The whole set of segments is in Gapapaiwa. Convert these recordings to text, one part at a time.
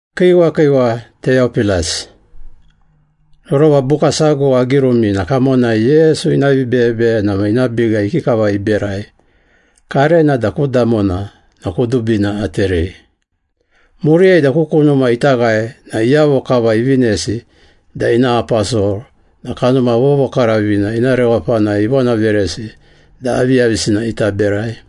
Kiiwa kiiwa, Teyopilas. Rorova buka sago agirumi na kamonai Yesu ina vibeyebeyena ma ina biga ikikava iberai, karena da ku damona na kudubina aterei. Muriyai da ku kunuma ita ghae na iyavo kava ivinesi da ina aposol na Kanuma Vovokaravina ina rewapanai ivonaveresi da aviyavisina ita berai.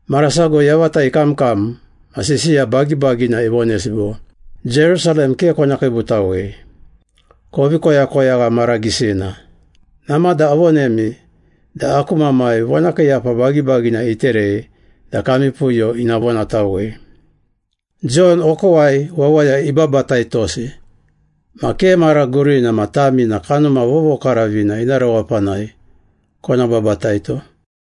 Mara sago yavata ikamkam ma sisiya bagibagina ivonesi bo, “Jerusalem ke kona kiibutawei, kovi koyakoyagha mara gisina. Namada avonemi da aku Mamai vonakiiyapa bagibagina iterei da kami puyo ina vonatawei. Jon okowai wawaya ibabataitosi ma ke mara gurina ma tami na Kanuma Vovokaravina ina rewapanai kona babataito.”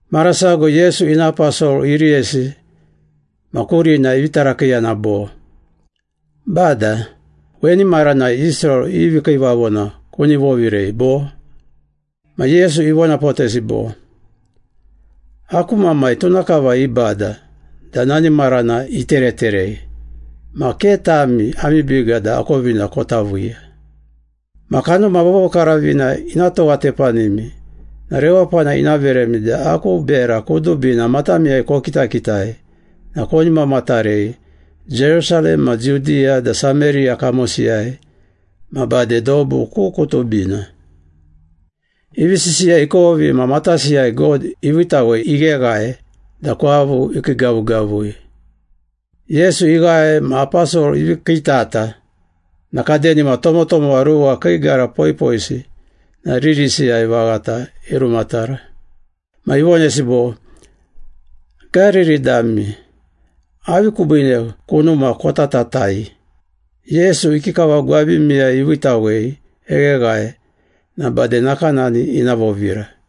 Mara sago Yesu ina aposol iriyesi ma kurina ivi tarakiiyana bo, “Bada, weni maranai Israel i vikiivavona kuni vovirei, bo?” Ma Yesu ivonapotesi bo, “Aku Mamai tuna kava ibada da nani marana itereterei ma ke tami ami biga da akovina kota viiya. Ma Kanuma Vovokaravina ina towatepanimi na rewapana ina veremi da aku bera kudubina matamiyai kokitakitai na koni mamatarei Jerusalem ma Judiya da Sameriya kamosiyai ma bade dobu ku kudubina.” Ivi sisiya ikovi ma matasiyai God iviitawei igheghae da kwavu ikiigavugavui. Yesu ighae ma aposol ivi kiitata na kadenima tomotomowa ruwa kii gara poipoisi na ririsiyai vaghata irumatara. Ma ivonesi bo, “Gariri dami, avi kubiine kunuma kotatatai? Yesu ikikava gwabimiyai iviitawei egheghae na bade nakanani ina vovira.”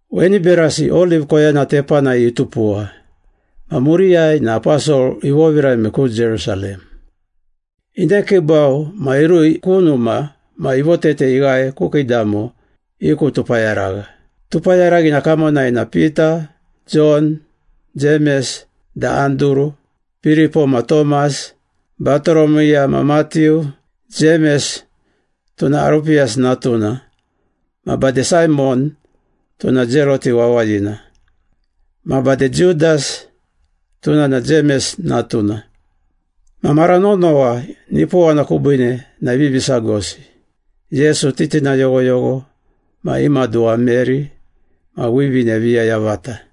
Weni berasi Oliv koyana tepanai itupuwa ma muriyai na aposol ivovirame ku Jerusalem. Inekiibau ma irui ku numa ma ivotete ighae ku kiidamo i ku tupayaragha. Tupayaraghina kamonai na Pita, Jon, Jemes da Anduru, Piripo ma Tomas, Batoromiya ma Matiu, Jemes (tuna Arupiyasi natuna), ma bade Saimon (tuna Zelote wawayina) ma bade Judas (tuna na Jemes natuna.) Ma mara nonowa nipowana kubiine na ivivi sagosi, Yesu titina yoghoyogho ma i maduwa Meri ma wivine viya yavata.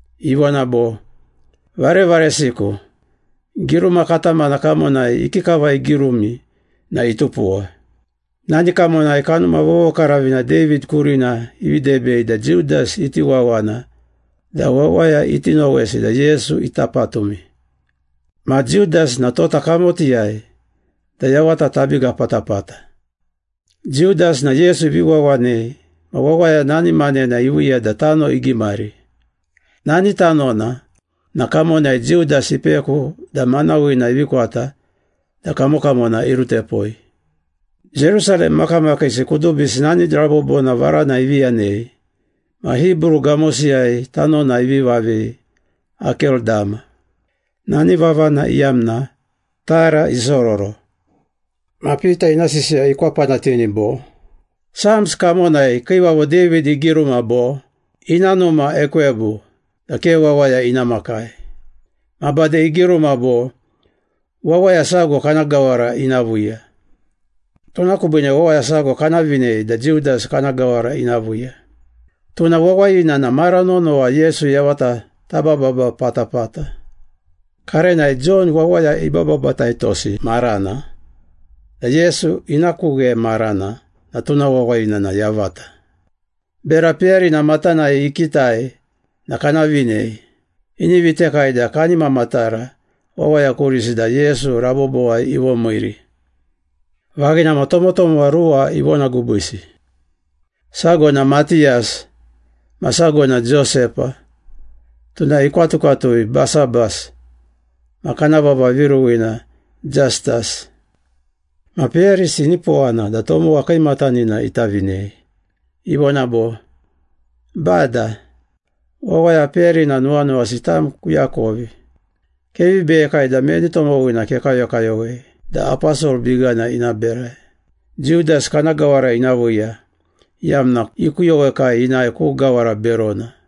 Ivona bo, “Varevaresiku, giruma katamana kamonai ikikava igirumi na itupuwa. Nani kamonai Kanuma Vovokaravina David kurina ivi debei da Judas iti wawana da wawaya iti nowesi da Yesu ita patumi. Ma Judas na tota kamotiyai da yavata tabiga patapata.” Judas na Yesu ivi wawanei ma wawaya nani manena iviiya da tano igimari. Nani tanona na kamonai Judas ipeku da manawina ivi kwata da kamokamona irutepoi. Jerusalem makamakiisi kudubisi nani rabobona varana ivi yanei ma Hibru gamosiyai tanona ivi vavei Akeldama, nani vavana iyamna ‘tara isororo.’ Ma Pita ina sisiya ikwapanatini bo, “Psalms kamonai Kiivavo David igiruma bo, ‘Ina numa ekwebu, da ke wawaya ina makai.’ Ma bade igiruma bo, ‘Wawaya sago kana gawara ina viiya.’” “Tuna kubiine wawaya sago kana vinei da Judas kana gawara ina viiya. Tuna wawayina na mara nonowa Yesu yavata tabababa patapata. Karenai Jon wawaya ibababataitosi maranai da Yesu ina ku ghe marana na tuna wawayina na yavata. Bera peyarina matanai ikitai na kana vinei. Ini vitekai da kani mamatara wawaya kurisi da Yesu rabobowai ivomiiri.” Vaghina ma tomotomowa ruwa ivonagubisi. Sago na Matiyas ma sago na Josepa (tuna ikwatukwatui Basabas, ma kana vava viruwina Jastas). Ma peyarisi inipowana da tomowa kiimatanina ita vinei. Ivona bo, “Bada, wawaya peyarina nuwanuwasi tam kuakovi. Kevi beyekai da meni tomowina kekayokayowei da aposol bigana ina berai. Judas kana gawara ina viiya, iyamna ikuyowekai inae ku gawara berona.”